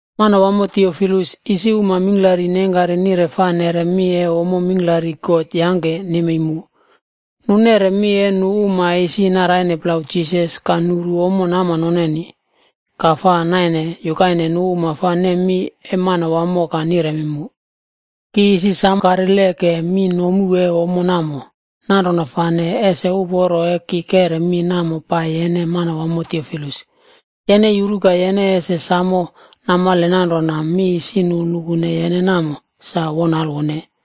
Manwamo Tiofilus, isi uma mingklari neingkari nire fa neꞌre mi e ommo mingklari God yangke nemei mu. Nu neꞌre mi e nu uma e isi naraine plau Jisas ka nuru ommo nama noneni, ka naimele nu fa naine yukaine nu uma fa nem mi e Manawamo ka niremi mu. Ki isi sam karile ke mi nomu e ommo namo. Nanrona fane ese uporo e ki keꞌre mi namo pai yene, Yene yuru ka yene ese samo namale nanrona, mi isi nu nukune yene namo, sa won alwone.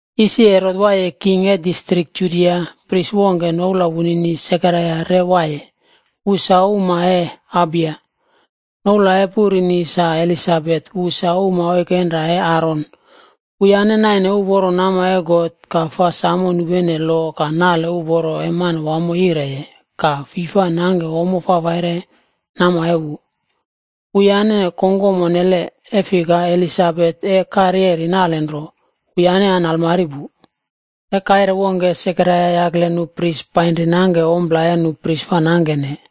Isi Herot waiye king e distrik Judia, pris wongke, noula wunini Sekaraia re waiye. Wu sa pris e waiye grup wongke fa nouwne Abiya. Noula e purini sa Elisabetb, wu sa uma oikenra e Aron. Wuyane naine uporo nama e God, ka fa samo nupene lo ka nale uporo e Manawamo yireye, ka fi fa nangke ommo fafaire nama e wu. Wuyane kongkom onnele, e fika Elisabet e karyeri nalenro. Wuyane an almari pu. E kaire wongke Sekaraia yakle nu pris painri nangke ompla e nu pris fa nangkene,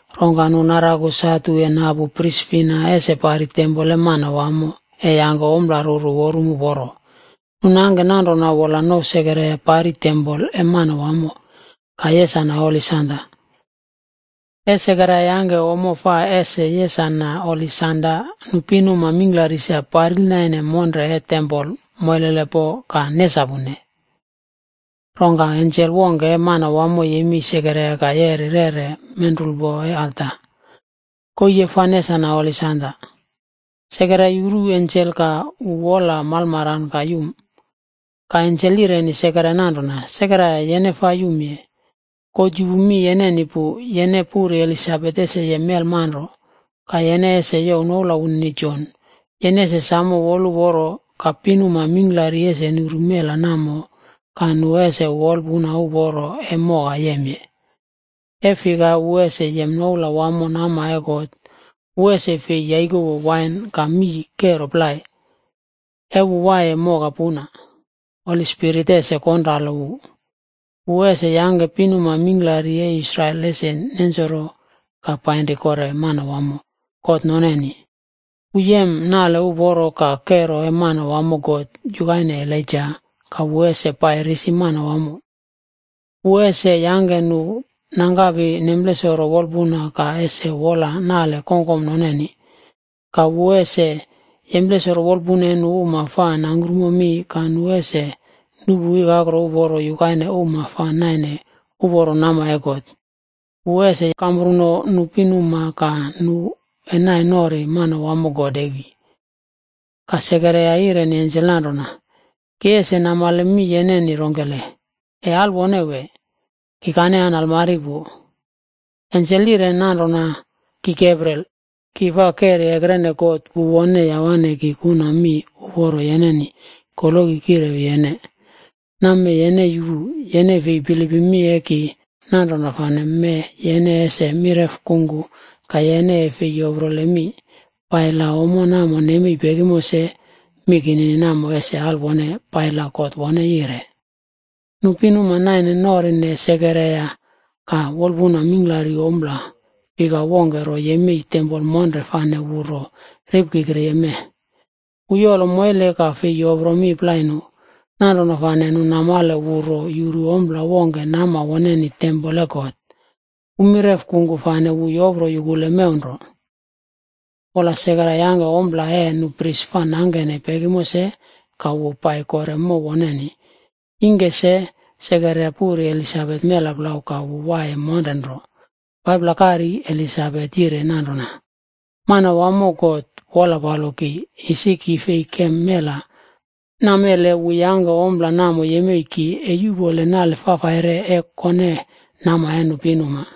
Rongka nu naraku satu e napu pris fina ese pari tempol e Manawamo, e yangke ompla ruru worum uporo. Nu nangke nanrona wola nouw Sekaraia pari tempol e Manawamo ka yesane holi sanda. E Sekaraia yangke ommo fa ese yesane holi sanda, nu pinuma mingklari sa paril naine monre e tempol moilelepo ka nesapune. Rongka ensel wongke e Manawamo yemei Sekaraia ka yeri rere menrulpo e alta, koii e fa nesanane holi sanda. Sekaraia yuru ensel ka wu wol malmaran ka yum. Ka ensel yireni Sekaraia nanrona, “Sekaraia, yene fa yumye. God yupu mi yeneni pu. Yene puri Elisabet ese yem melmanro. Ka yene ese youw noula wunini Jon. Yene ese samo woluporo. Ka pinuma mingklari ese nuru mela namo ka nu ese wolpuna uporo e moka yemye wu, e fika wu ese yem noula wamo nama e Manawamo. Wu ese fei yaikowo wain, ka mii kero plai. E wu waiye moka puna, Holi Spirit ese konralo wu. Wu ese yangke pinuma mingklari e Israel ese nensoro ka painri kore Manawamo, God noneni. Wu ese yem kero e Manawamo God yukaine Elaija ka wu ese pai risi Manawamo. Wu ese yangke nu nangkapi nemplesoro wolpuna ka ese wola naꞌle kongkom noneni. Ka wu ese yemplesoro wolpuna e nu uma fa nangkrumo mi, ka nu ese nuꞌpu ikakro uporo yukaine uma fa naine uporo nama e God. Wu ese kampruno nu pinuma ka nu e nai nori Manawamo God ese wi.” Ka Sekaraia yireni ensel nanrona, “Ki ese namale mi yeneni rongkele, e alwone wee? Kikane an almari pu.” Ensel yire nanrona, “Ki Gabriel, ki fa keri ekrene God, wu wone yawane ki kuna mi uporo yeneni, koloki kirewi yene. Nammee yene yupu. Yene fi bilipim mi e ki, nanrona fane mee yene ese mireꞌfa kungku ka yene e fei yoprole mi, pai la ommo namo nemei pekimo se. Mi kinini namo ese alwone pai la God wone yire.” Nu pinuma naine norine Sekaraia, ka wolpun mingklari ompla fika wongke ro yemei wu tempol monre fane wu ro ripkikriye mee. E wu yolo moile wu fei yopro mi plai nu. Nanrona fane nu namale, wu ro yuru ompla wongkeni nama woneni tempol e God. Wu mireꞌfa kungku fane wu yopro yukuleye mew nro. Wola Sekaraia yangke ompla e nu pris fa nangkene pekimo se, ka wu pai kore mow woneni. Ingke se, Sekaraia puri Elisabet mela plau. Ka wu waiye monre nro 5pla kari. Elisabet yire nanrona, “Manawamo God wola palo ki, isi ki fei kem mela. Namele wu yangke ompla namo yemei ki e yuꞌpole nale sem e kone nama e nu pinuma.”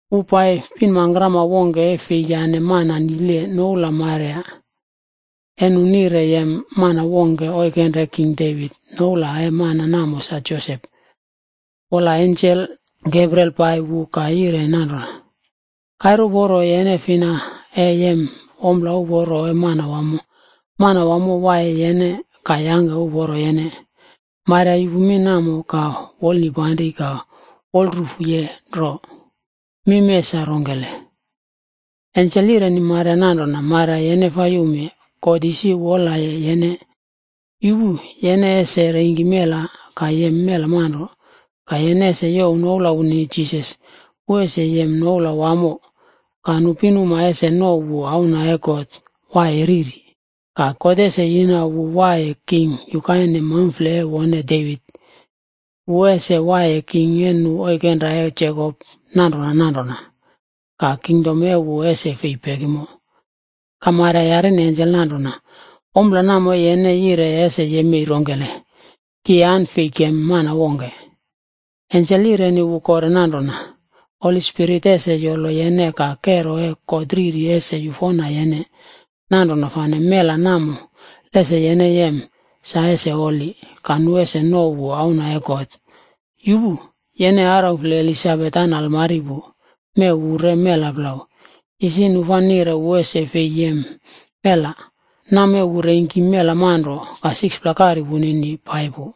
Wu pai pinmangkrama wongke e fei yane mana nile, noula Maria e nu nire e yem mana wongke oikenra e King Devit, noula e mana namo sa Josep. Wola ensel Gabriel pai wu ka yire nanrona, “Kaire uporo yene fina e yem ompla uporo e Manawamo. Manawamo waiye yene, ka yangke uporo yene.” Maria yupu mi namo, ka wu wolnipanri ka wol rufuye nro, “Mi mee sa rongkele?” Ensel yireni Maria nanrona, “Maria yene fa yumye. God wolyapaye yene. Yupu. Yene ese reingki mela ka yem mela manro. Ka yene ese youw noula wunini Jisas. Wu ese yem noula wamo. Ka nu pinuma ese nouw wu Auna e God Waiye Riri. Ka God ese yina wu waiye king yukaine maumfle e wone Devit. Wu ese waiye king e nu oikenra e Jekop nanrona nanrona. Ka kingdom e wu ese fei pekimo.” Ka Maria yarine ensel nanrona, “Ompla namo e yene yireye ese yemei rongkele? Ki an fei kem mana wongke.” Ensel yireni wu kore nanrona, “Holi Spirit ese yolo yene, ka kero e God Riri ese yufona yene. Nanrona fane mela namo lese yene yem, sa ese holi. Ka nu uma ese nouw wu Auna e God. Yupu. Yene araufle Elisabet an almari pu, mee wu re mela plau. Isi nu fa nire wu ese fei yem mela. Nammee wu reingki mela manro, ka 6pla kari wunini pai pu.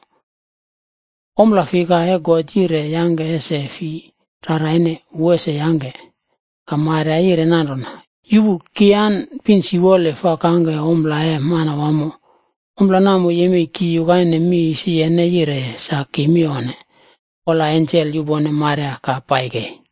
Ompla fika e God yire yangke ese fi raraine, wu ese yangke.” Ka Maria yire nanrona, “Yupu! Ki an pin siwole fa kangke ompla e Manawamo. Ompla namo yemei ki yukaine mi isi yene yireye, sa ki mi onne.” Wola ensel yupone Maria ka pai kei.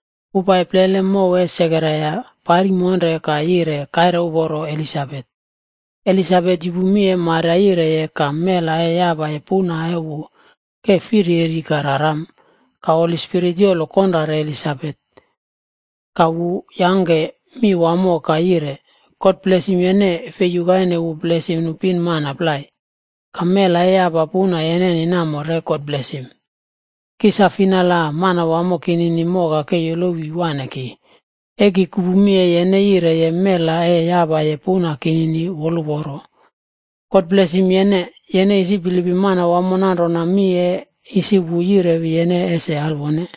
Wu pai plele mow e Sekaraia, pari monre ka yire, kaire uporo Elisabet. Elisabet yupu mi e Maria yireye, ka mela e yapaye puna e wu ke firyeri ka raram. Ka Holi Spirit yolo konrare Elisabet, Ka wu yangke mi wamo ka yire, “God blesim yene, fei yukaine wu blesim nu pinmana plai. Ka mela e yapaye puna yeneni namo, re God blesim. Ki sa fina la Manawamo kinini moka ke yolowi wane ki? E ki kupu mi e yene yireye, mela e yapaye puna kinini woluporo. God blesim yene, yene isi bilipim Manawamo nanrona mi e isi wu yirewi yene ese alwone.”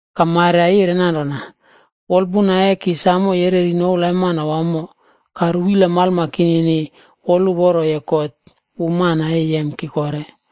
Ka Maria yire nanrona: “Wolpuna e ki samo yereri noula e Manawamo. Ka ruwila malma kinini woluporoye God, wu Mana e Yem Ki Kore.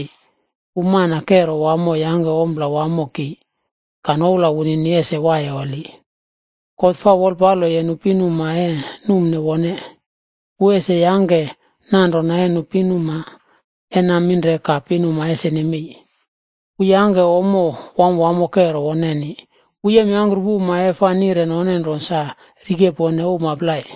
E fika God wu Kero Wamo yangke ompla wamo ki, ka noula wunini ese waiye holi. God fa wolpalo nu pinuma e numne wone. Wu ese yangke nanrona e nu pinuma e naminre ka pinuma ese nemei. Wu yangke ommo wamwamo, kero woneni. Wu yemyangkrupu uma e fa nire none nro sa rikepone uma plai.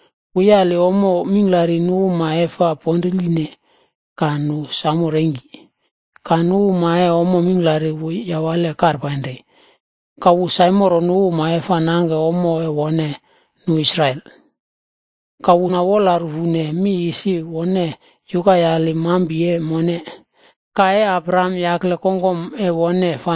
Wu yali ommo mingklari nu uma e fa ponriline, ka nu samo reingki. Ka nu uma e ommo mingklari, wu yawale karpainri. Ka wu saimoro nu uma fa nangke ommo e wone, sa nu Israel. Ka wu na wola rufuye mi isi wone yukayali mampi e mone, ka e Abraham yakle kongkom e wone,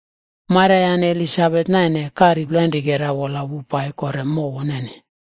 Maria yane Elisabet naine kari plainrikera, wola wu pai kore mow woneni.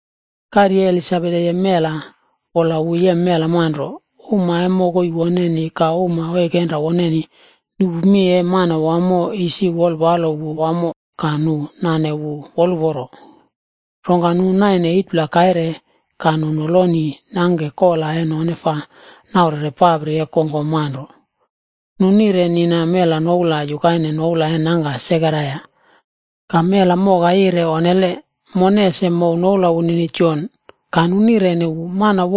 Kari e Elisabet e yem mela, wola wu yem mela manro. Uma e mokoi woneni ka uma oikenra woneni nupu mi isi Manawamo wolpalo wu wamo, ka nu nane wu woluporo. Rongka nu naine 8pla kaire se, nu noloni nangke kola e noneni fa naurene papri e kongkom manro. Nu nire nina mela noula yukaine noula e nangka Sekaraia. Ka mela moka yire, “Onnele. Mone ese mouw noula wunini Jon.” Ka nu nireni wu,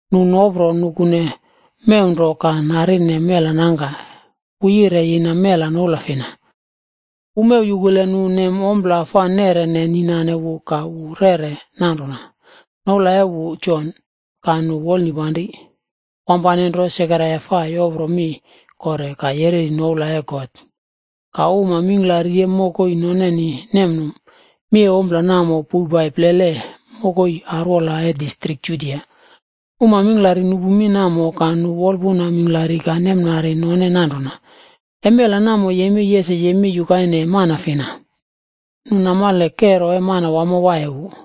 Nu nopro nukune mew nro ka narine mela nangka, wu yire yina mela noula fina. Wu mew yukule nu nem ompla fa neꞌrene ni nane wu, ka wu reꞌre nanrona, “Noula e wu Jon.” Ka nu wolnipanri. Wampane nro Sekaraia fa yopro mi kore, ka yereri noula e God. Ka uma mingklari e mokoi noneni nemnum. Mi e ompla namo poupai plele mokoi arwola e nenene distrik Judia. Uma mingklari nupu mi namo, ka nu wolpuna mingklari ka nemnari none nanrona, “E mela namo yemei ese yemei yukaine mana fina?” E fika, nu e namale kero e Manawamo waiye wu.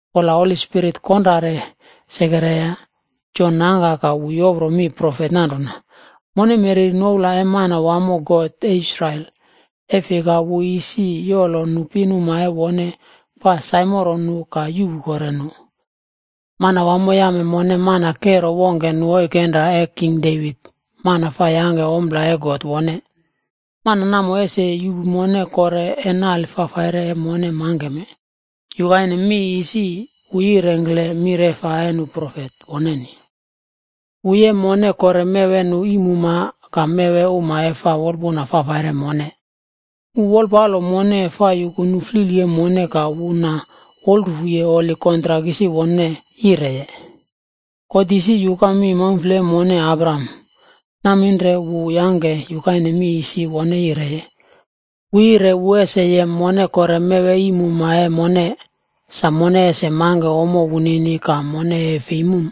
Wola Holi Spirit konrare Sekaraia, Jon nangka ka wu yopro mi profet nanrona: “Mone mereri noula e Manawamo God e Israel. E fika wu isi yolo nu pinuma e wone fa saimoro nu ka yuꞌpu kore nu. Manawamo yame mone mana kero wongke nu oikenra e king Devit, mana fa yangke ompla e God wone. Mana namo ese yuꞌpu mone kore e nale fafaire e mone mangkeme, yukaine mi isi wu yirengkle mireꞌfa e nu profet woneni. Wu yuka mi yire wu e yem mone kore mew e nu iim uma ka mew e uma e fa wolpuna fafaire mone. Wu wolpalo mone fa yuku nu flili e mone ka wu na wolrufuye holi kontrak isi wone yireye. God isi yuka mi maumfle e mone Abraham. Naminre wu yangke yukaine mi isi wone yireye. Wu yire wu ese yem mone kore mew e iim uma e mone, sa mone ese mangke ommo wunini ka mone e fei mum.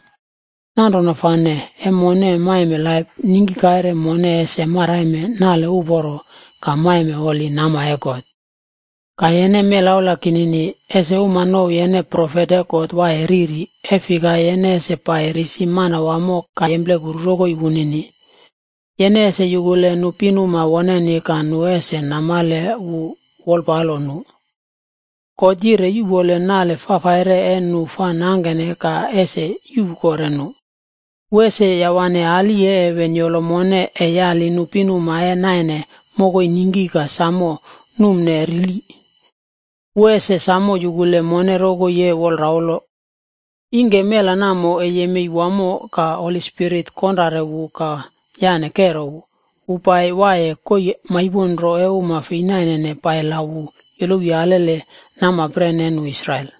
Nanrona fane e mone maime laip, ningki kaire mone ese maraime nale uporo ka maime holi nama e God. Ka yene melaula kinini, ese uma nouw yene profet e God Waiye Riri, e fika yene ese pai risi Manawamo ka yemplekuru rokoi wunini. Yene ese yukule nu pinuma woneni ka nu ese namale wu wolpalo nu wamo, yire yuꞌpole nale fafaire e nu fa nangkene ka ese yuꞌpu kore nu. Wu ese yawane ali e heven yolo mone, e yali nu pinuma e naine mokoi ningki ka samo numne rili. Wu ese samo yukule mone rokoi e wolraulo.” Ingke mela namo e yemei wamo, ka Holi Spirit konrare wu ka yane wu kero. Wola wu pai waiye koii maipon nro e uma fei nainene, pai la wu yolowi alele namapren e nu Israel.